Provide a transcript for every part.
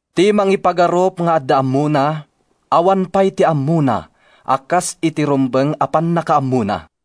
Ti mangipagarup nga adda ammona, awan pay ti ammona a kas iti rumbeng a pannakaammona.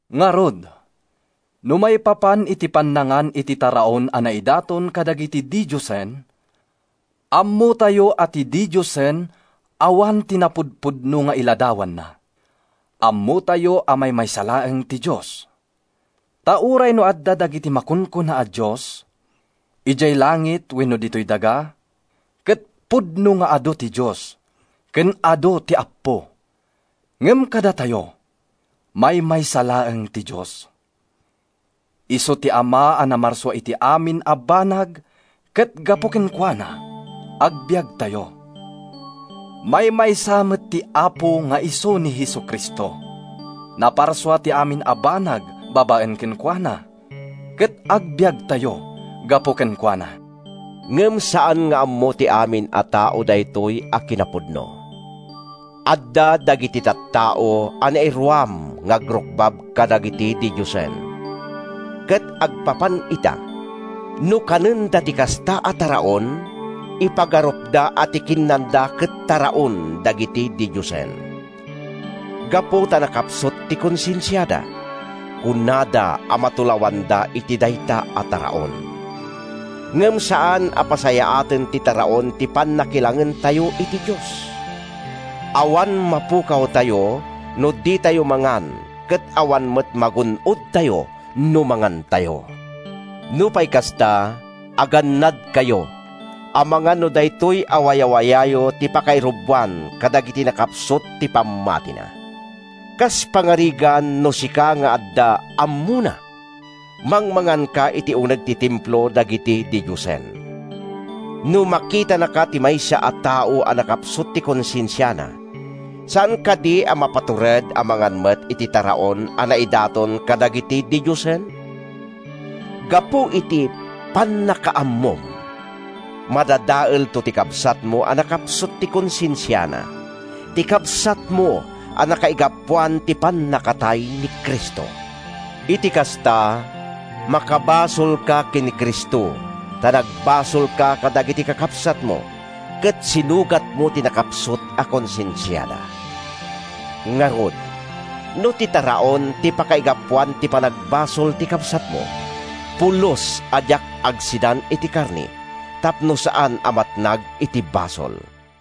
Ngarud, no maipapan iti pannangan iti taraon a naidaton kadagiti didiosen, ammotayo a ti didiosen awan ti napudpudno nga iladawanna; ammotayo a maymaysa laeng ti Dios. Ta uray no adda dagiti makunkuna a “dios,” idiay langit wenno ditoy daga—ket pudno nga adu ti “dios” ken adu ti “appo”— ngem kadatayo, maymaysa laeng ti Dios. Isu ti Ama a namarsua iti amin a banag ket gapu kenkuana, agbiagtayo. Maymaysa met ti Apo nga isu ni Jesu-Cristo. Naparsua ti amin a banag babaen kenkuana ket agbiagtayo gapu kenkuana. Ngem saan nga ammo ti amin a tao daytoy a kinapudno. Adda dagiti tattao a nairuam nga agrukbab kadagiti didiosen, ket agpapan ita, no kanenda ti kasta a taraon, ipagarupda a ti kinnanda ket taraon dagiti didiosen. Gapu ta nakapsut ti konsensiada, kunada a matulawanda iti dayta a taraon. Ngem saan a pasayaaten ti taraon ti pannakilangentayo iti Dios. Awan mapukawtayo no ditayo mangan ket awan met magun-odtayo no mangantayo. Nupay kasta, agannadkayo amangan no daytoy a wayawayayo ti pakairuboan kadagiti nakapsut ti pammatina. Kas pagarigan, no sika nga adda “ammona,” mangmanganka iti uneg ti templo dagiti didiosen. No makitanaka ti maysa a tao a nakapsut ti konsensiana, saan kadi a mapatured a mangan met iti taraon a naidaton kadagiti didiosen? Gapu iti “pannakaammom,” madadaelto ti kabsatmo a nakapsut ti konsensiana, ti kabsatmo a nakaigapuan ti pannakatay ni Cristo! Iti kasta, makabasolka ken ni Cristo ta nagbasolka kadagiti kakabsatmo ket sinugatmo ti nakapsut a konsensiada. Ngarud, no ti taraon ti pakaigapuan ti panagbasol ti kabsatko, pulos a diak agsidan iti karne tapno saan a matnag iti basol.